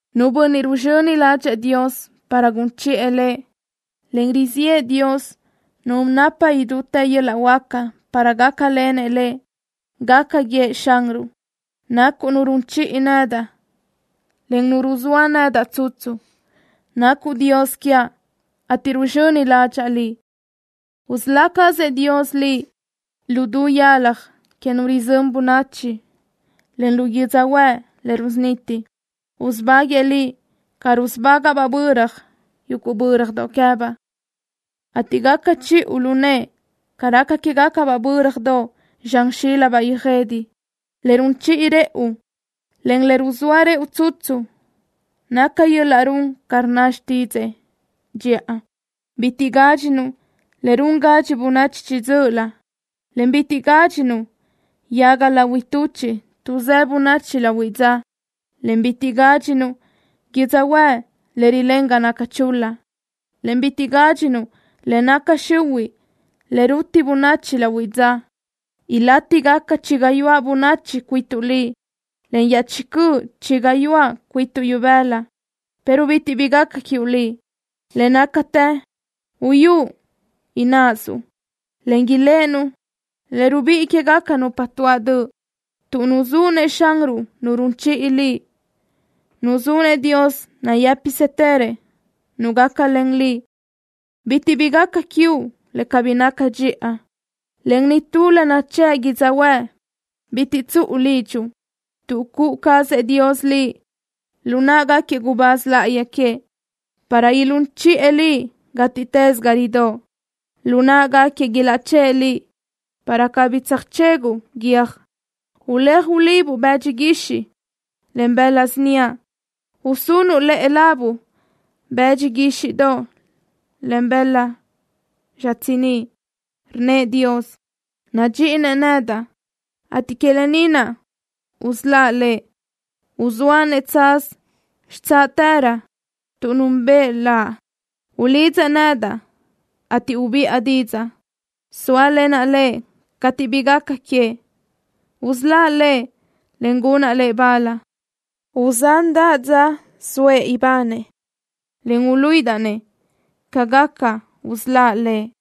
Nu bönniʼ ruzxöni ládxëʼë Dios para gun chiʼë lëʼ, en riziʼë Dios Nu napa idútë yöl-laʼ huáca, para gácalenëʼ lëʼ, gaca guiëʼ Xanruʼ: “Nacuʼ Nu run chiʼi nedaʼ, en Nu ruzóa nedaʼ tsutsu. Nacuʼ Dios quiaʼ, ateʼ ruzxöni ládxaʼa Liʼ.” Usölá cazëʼ Dios Liʼ lu du yalaj que nu rizö́n bönachi, en lu yödzöhuë́ʼ le rusuniti. Usubáguëʼë liʼ ca rusubágaʼbaʼ böra yuguʼ bö́radoʼ queë́baʼ, ateʼ gaca chiʼu lu nëʼë ca raca quégacabaʼ bö́radoʼ zxan xílabaʼ yöjede. Le run chiʼi rëʼu, en le ruzóa rëʼu tsutsu naca yöl-laʼ run ca rnna xtídzëʼë cheëʼ. Bitiʼ gádxinuʼ le run gadxi bönachi chiʼi dzö́ʼölö, en bitiʼ gádxinuʼ yaga lahui tuchiʼ tuʼsë́ bönachi lahuiʼ dza, en bitiʼ gádxinuʼ yödzöhuë́ʼ le rilén ga naca chul-la, en bitiʼ gádxinuʼ le naca xihuiʼ le ruti bönachi lahuiʼ dza. Ilátigaca chi gayuáʼ bönachi cuituʼ liʼ, en iaʼchí cöʼ chi gayuáʼ cuituʼ ibëla, pero bitiʼ bi gaca quiuʼ liʼ. Le nácatë uyú ináʼasuʼ, en iléʼenuʼ le rubíʼi quégaca nupa tuáʼ döʼ. Tuʼ nuzúʼ-nëʼ Xanruʼ Nu run chiʼi liʼ, nuzúʼ-nëʼ Dios nayë́pisëtërëʼ Nu gácalen liʼ, bitiʼ bi gaca quiuʼ le cabí naca dxiʼa, en nitú le nachë́ʼ yödzöhuë́ʼ bitiʼ tsuʼu lidxuʼ, tuʼ cuʼu cazëʼ Dios liʼ lu náʼagaquiëʼ gubáz láʼayi queëʼ, para ilún chiʼë liʼ gátiʼtës ga ridóʼ. Lu náʼagaquiëʼ ilaʼchë́ʼë liʼ, para cabí tsöjchéguʼu guiö́j. Uléaj ulibuʼ bëdxi guixiʼ, en bëla síniaʼ. Usunuʼ lëʼe labuʼ bëdxi guíxiʼdoʼ, en bëla xitsiníʼ. Rnnëʼ Dios: “Nadxiʼinëʼ nedaʼ, ateʼ que lë ni naʼ usöláʼ lëʼ. Uzóaʼ-nëʼ tsaz xitsáʼtërö tuʼ núnbëʼë Laʼ. Ulidzëʼ nedaʼ, ateʼ ubiʼa didzaʼ. Sóalenaʼ lëʼ cateʼ bi gaca queëʼ. Usöláʼ lëʼ, en gunaʼ lëʼ bal. Uzándaʼa dza soëʼ ibanëʼ, en uluíʼidaʼ-nëʼ ca gaca usöláʼ lëʼ.”